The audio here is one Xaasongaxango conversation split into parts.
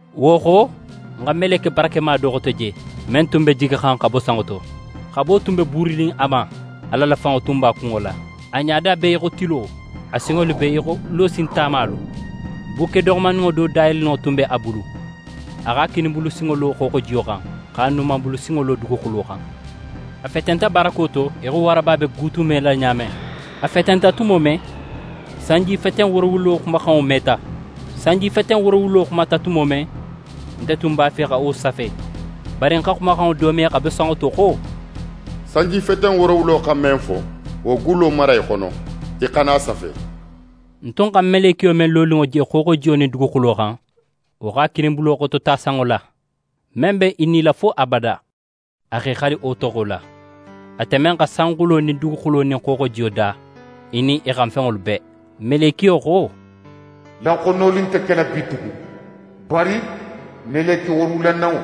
Wo xo, ń xa meleke barakema do xote je, men tun be jigixan xa bo sanŋo to. Xabo tun be buurinin a ma, Ala la fanŋo b'a kunŋo la. A ɲada be í xo tilo, a sinŋolu be í xo losin tamalu. Bukke doxomandinŋo do dayeleninŋo tun be a bulu. A x'a kininbulu sinŋo lo xooxojiyo xan, x'a numanbulu sinŋo lo duguxulo xan. A fetenta barako to í xo waraba be guutumela ɲa men. A fetenta tumo men, sanjifeten woorowulo xumaxanŋo meta. Sanjifeten woorowulo xumata tumo men, nte tun b'a fe xa wo safe, bari ń xa xumaxanŋo do me xa bo sanŋo to xo: «Sanjifeten woorowulo xa men fo, wo gullo mara í xono, í xana a safe.» Ń tun xa melekiyo men loninŋo je xooxojiyo nin duguxulo xan, wo x'a kininbulo xotota sanŋo la. Men be í nila fo abada, a x'é xali wo toxo la, ate men xa sanxulo nin duguxulo nin xooxojiyo da, i nin i xan fenŋolu bee. Melekiyo xo: «Laxonoli nte kela bitugun! Bari meleke woorowulananŋo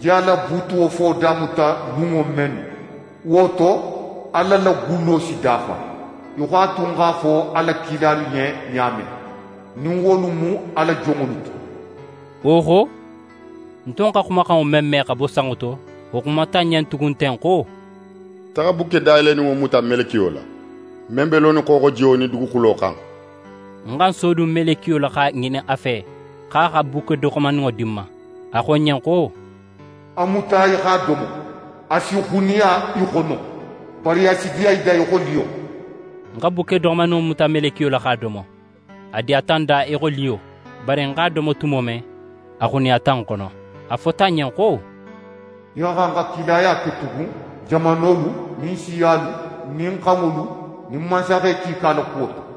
je a la buutuwo fo damuta lunŋo mennu, wo to, Ala la gullo si dafa, í xo a tun x'a fo a la kilalu ɲen ɲa men, nin wolu mu a la jonŋolu ti.» Wo xo, ń tun xa xumaxanŋo men me xa bo sanŋo to, wo xumata ń ɲen tugun ten xo: «Taxa bukke dayeleninŋo muta melekiyo la, men be lonin xooxojiyo nin duguxulo xan.» Ń xa ń sodun melekiyo la x'a ŋinin a fe, xo a xa bukke doxomandinŋo di ń ma. A xo ń ɲen xo: «A muta í x'a domo. A si xuniya í xono, bari a si diya í da í xo liyo.» Ń xa bukke doxomandinŋo muta melekiyo la x'a domo. A diyata ń da í xo liyo; bari ń x'a domo tumo men, a xuniyata ń xono. A fota ń ɲen xo: «Í xa xan xa kilaya ke tugun jamanolu nin siyalu nin xanŋolu nin mansaxe kiika la kuwo to.»